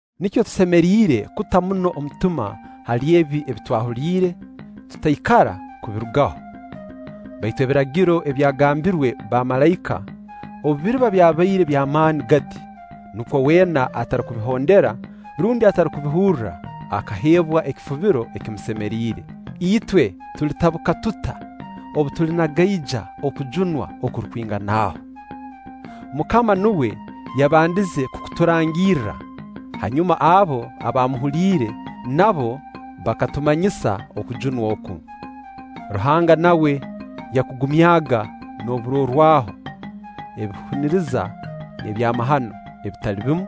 Nikyo tusemeriire kuta muno omutima hali ebi twahuliire, tutaikara kubirugaho. Baitu Ebiragiro ebyagambirwe bamalaika, obu biriba byabaire by'amaani gati, nukwo weena atarukubihondera rundi atarukubihurra akaheebwa ekifubiro ekimusemeriire, itwe tulitabuka tuta obu tulinagaija okujunwa okurukwingana aho? MUKAMA nuwe yabandize kukuturangirra, hanyuma abo abaamuhuliire nabo bakatumanyisa okujunwa oku. Ruhanga nawe yakugumyaga n'oburorwaho, ebihuniriza, n'ebyamahano ebitali bimu,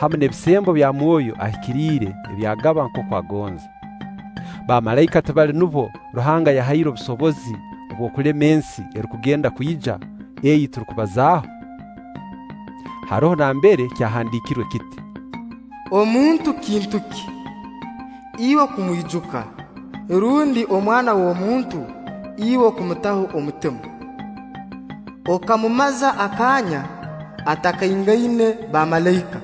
hamu n'ebisembo bya Mwoyo Ahikiriire ebi agaba nkooku agonza. Bamalaika tibali nubo Ruhanga yahaire obusobozi bw'okulema ensi erukugenda kwija, ei turukubazaaho. Haroho nambere kyahandiikirwe kiti: “Omuntu kintu ki, Iwe kumwijuka, rundi omwana w'omuntu, Iwe kumutaho omutima? Okamumaza akaanya, atakaingaine bamalaika;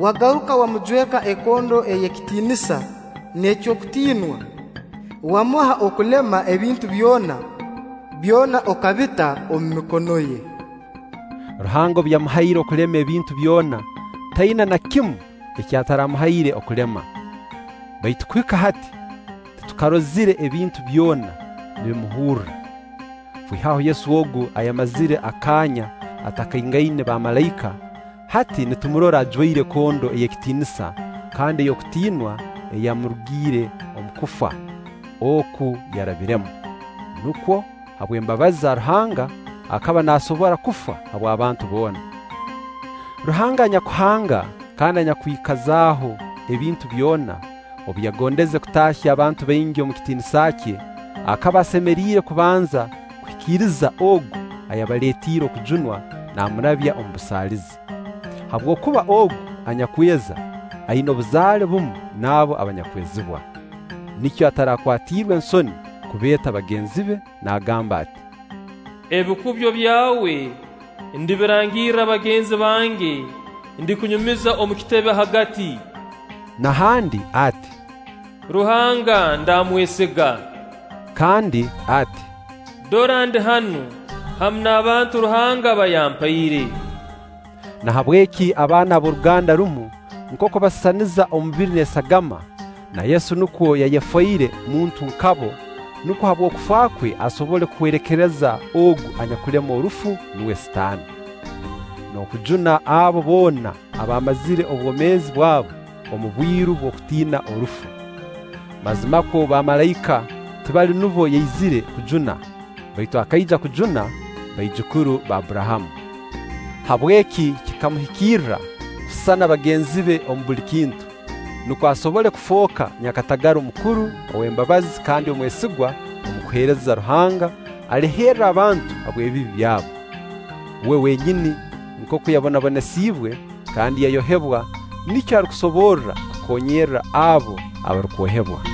wagaruka wamujweka ekondo y'ekitiinisa n'ey'okutiinwa, wamuha okulema ebintu byona; byona okabita omu mikono ye.” Ruhanga obu yamuhaire okulema ebintu byona, taina na kimu eki ataramuhaire okulema. Baitu kuhika hati, titukarozire ebintu byona nibimuhurra. Kwihaho Yesu ogu ayamazire akaanya atakaingaine bamalaika, hati nitumurora ajwaire ekondo ey'ekitiinisa kandi ey'okutiinwa eyamurugiire omu kufa oku yarabiremu; nukwo, habw'embabazi za Ruhanga, akaba naasobora kufa habw'abantu boona. Ruhanga anyakuhanga kandi anyakwikazaaho ebintu byona, obu yagondeze kutaahya abantu baingi omu kitiinisa kye, akaba asemeriire kubanza kuhikiriza ogu ayabaleetiire okujunwa naamurabya omu busaalizi. Habwokuba ogu anyakweza, aina obuzaale bumu n'abo abanyakwezibwa. Nikyo atakwatirwa nsoni kubeeta bagenzi be, naagamba ati: “Ebikubyo byawe ndibirangirra bagenzi bange, ndikunyumiza omu kitebe hagati.” Na handi ati: “Ruhanga ndamwesiga.” Kandi ati: “Dora ndi hanu, hamu n'abantu Ruhanga aba yampaire.” Nahabweki abaana ab'oruganda rumu nkooku basisaniza omubiri n'esagama, na Yesu nukwo yayefoire muntu nka bo, nukwo habw'okufa kwe asobole kuhwerekereza ogu anyakulema orufu, nuwe Sitaani, n'okujuna abo boona abaamazire obwomeezi bwabo omu bwiru bw'okutiina orufu. Mazimakwo bamalaika tibali nubo yaizire kujuna, baitu akaija kujuna baijukuru ba Abburahamu. Habweki kikamuhikirra kusisana bagenzi be omu buli kintu, nukwo asobole kufooka nyakatagara omukuru, ow'embabazi kandi omwesigwa omu kuheereza Ruhanga, aleherre abantu habw'ebibi byabo. Uwe wenyini nkooku yabonabonesiibwe kandi yayohebwa, nikyo arukusoborra kukoonyera abo abarukwohebwa.